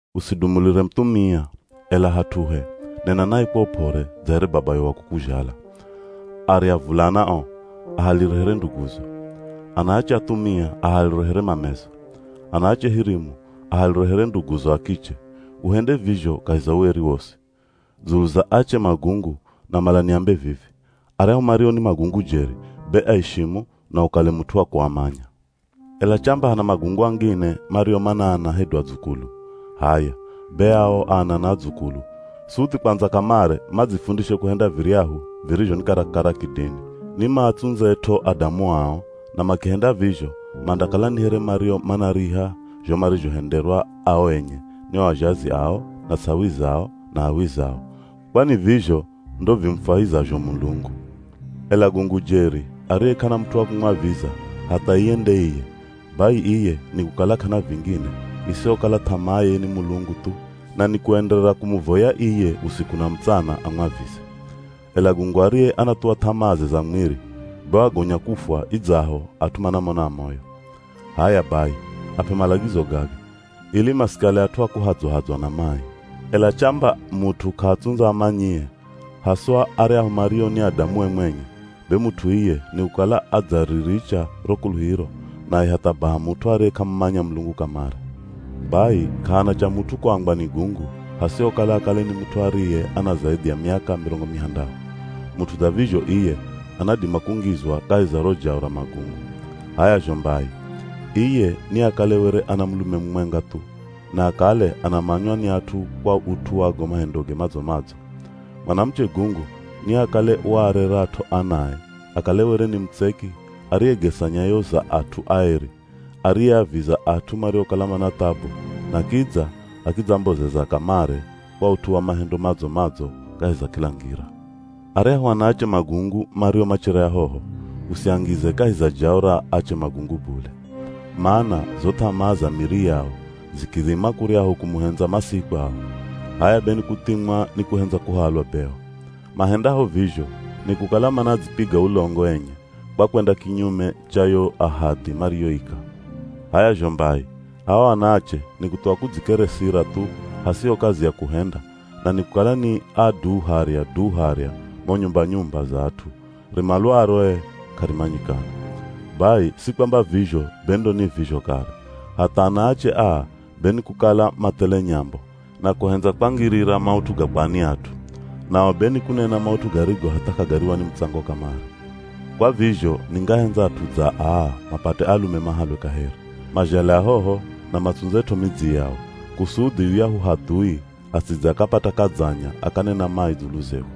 Usidumulire muthumia, ela hat'uhe, nena naye kwa up'ore dza here babayo wa kukuzhala. Arya avulana o, ahalire here nduguzo. Anaache athumia ahalire here mamezo. Anaache hirimu ahalire here nduguzo a kiche, uhende vizho kahi za ueri wosi. Dzulu za ache magungu namala niambe vivi, aryahu mario ni magungu jeri, be aishimu na ukale mut'u wa kuamanya. Ela chamba hana magungu angine mario mana ana hedu adzukulu, h'aya, be ao ana na adzukulu suthi kwandza kamare madzifundishe kuhenda viryahu virizho ni karakara kidini. Ni maatsundzet'o adamu ao na makihenda vizho mandakala ni here mario manariha zho marizhohenderwa ao enye ni o azhazi ao na ts'awizao na h'awizao, kwani vizho ndo vimufwahizazho Mulungu. Ela gungu jeri ariye k'ana mut'u wa kumwaviza hatha iye nde iye, bai iye ni kukala k'ana vingine isihokala th'amaaye ni Mulungu thu, na nikuenderera kumuvoya iye usiku na mutsana amwavize. Ela gungu ariye anathuwa th'amaaze za mwiri, be wagonya kufwa idzaho at'u manamona amoyo. H'aya bai ap'e malagizo gaga, ili masikale at'u a kuhadzwa-hadzwa na mai. Ela chamba mut'u k'aatsundza amanyie, haswa aryahu mario ni adamue mwenye, be mut'u iye ni kukala adzariricha ro kuluhiro naye hatha baha mut'u ariye k'amumanya Mulungu kamare. Bai k'ahana cha mut'u kuambwa ni gungu hasihokala akale ni mut'u ariye ana zaidhi ya miaka mirongo mihandahu. Mut'u dza vizho iye anadima kungizwa kahi za ro jao ra magungu. H'aya zho mbai, iye niakale were ana mulume mumwenga thu, na akale anamanywa ni at'u kwa ut'u wa go mahendoge madzo-madzo. Mwanamuche gungu niakale waarerat'o anae akale were ni mutseki ariyegesa nyayo za at'u aeri, ariyeaviza at'u mariokala mana thabu na kidza akidzambozeza kamare kwa ut'u wa mahendo madzo-madzo kahi za kila ngira. Aryahu anaache magungu mario machere ahoho, usiangize kahi za jao ra ache magungu bule. Mana zo th'amaa za miri yao zikidhima kuryahu kumuhendza Masihi kwao, h'aya be ni kuthimwa ni kuhendza kuhalwa beo. Mahendaho vizho, ni kukala manadzipiga ulongo enye kwa kwenda kinyume cha yo ahadhi mariyoika. H'aya zho mbai, ao anaache ni kuthuwa kudzikeresira thu hasiho kazi ya kuhenda na ni kukala ni a du harya, du harya mo nyumba-nyumba za at'u, rimalwaro ee k'arimanyikana. Bai si kwamba vizho be ndo ni vizho kare, hatha anaache aa be ni kukala mathele nyambo, na kuhendza kwangirira maut'u ga kwa ni at'u. Nao be ni kunena maut'u garigo hatha k'agariwa ni mutsango kamare. Kwa vizho ningahendza at'u dza aa mapate alume mahalwe kaheri, mazhale ahoho na matsundzet'o midzi yao, kusudhi yuyahu hadhui asidze akapata kadzanya akanena mai dzulu zehu.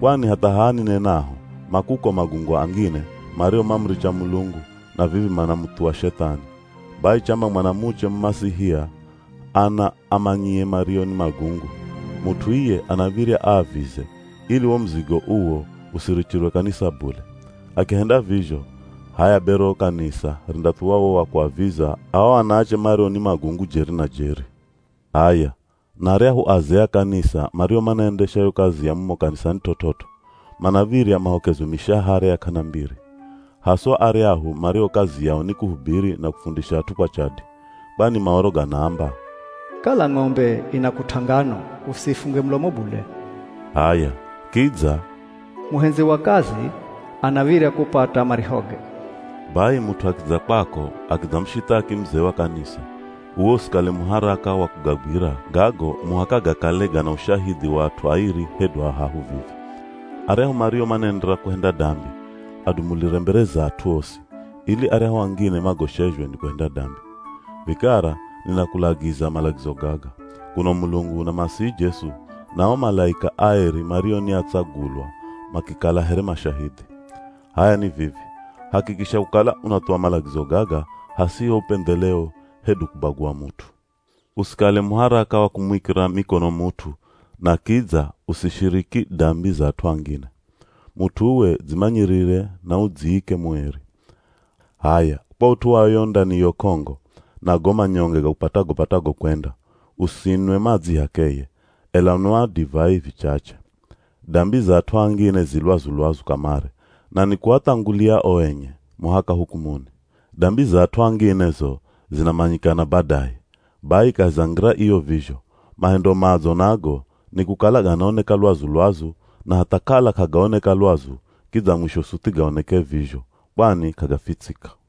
Kwani hatha haha ninenaho ma kuko magungu angine mario mamuricha Mulungu na vivi manamuthuwa Shethani. Bai chamba mwanamuche Mumasihia ana amanyie mario ni magungu, mut'u iye anav̱irya aavize ili wo muzigo uwo usirichirwe kanisa bule. Akihenda vizho, h'aya be ro kanisa rindathuwa wo wa kuaviza ao anaache mario ni magungu jeri na jeri. H'aya, na aryahu azee a kanisa mario manaendesha yo kazi ya mumo kanisani t'ot'ot'o, manav̱irya mahokezwe mishahara ya k'ana mbiri. Haswa aryahu mario kazi yao ni kuhubiri na kufundisha at'u kwa chadi. Kwani Maoro ganaamba, “Kala ng'ombe inakut'a ngano, usiifunge mulomo bule.” H'aya, kidza “Muhendzi wa kazi anav̱irya kupata marihoge.” Bai mut'u akidza kwako akidzamushithaki muzee wa kanisa, uwe usikale muharaka wa kugagwira gago muhaka gakale gana ushahidhi wa at'u airi hedu ahahu vivi. Aryahu mario manaenderera kuhenda dambi, adumulire mbere za at'u osi, ili aryahu angine magoshezhwe ni kuhenda dambi. Vikara ninakulagiza malagizo gaga, kuno Mulungu na Masihi Jesu, na o malaika aeri mario ni atsagulwa makikala here mashahidhi. H'aya ni vivi, hakikisha kukala unathuwa malagizo gaga hasiho upendheleo hedu kubagua mut'u. Usikale muharaka wa kumuikira mikono mut'u na kidza usishiriki dambi za at'u angine. Mut'u uwe dzimanyirire na udziike mueri. H'aya kwa ut'u wa yo ndaniyo k'ongo, na go manyonge gakupatago-patago kwenda, usinwe madzi h'akeye, ela nwa divai vichache. Dambi za at'u angine zi lwazu-lwazu kamare na nikuathangulia o enye, muhaka hukumuni. Dambi za at'u angine zo zinamanyikana badaye. Bai kahi za ngira iyo vizho, mahendo madzo nago nikukala ganaoneka lwazu-lwazu na hatha kala k'agaoneka lwazu kidza mwisho suthi gaoneke vizho, kwani k'agafitsika.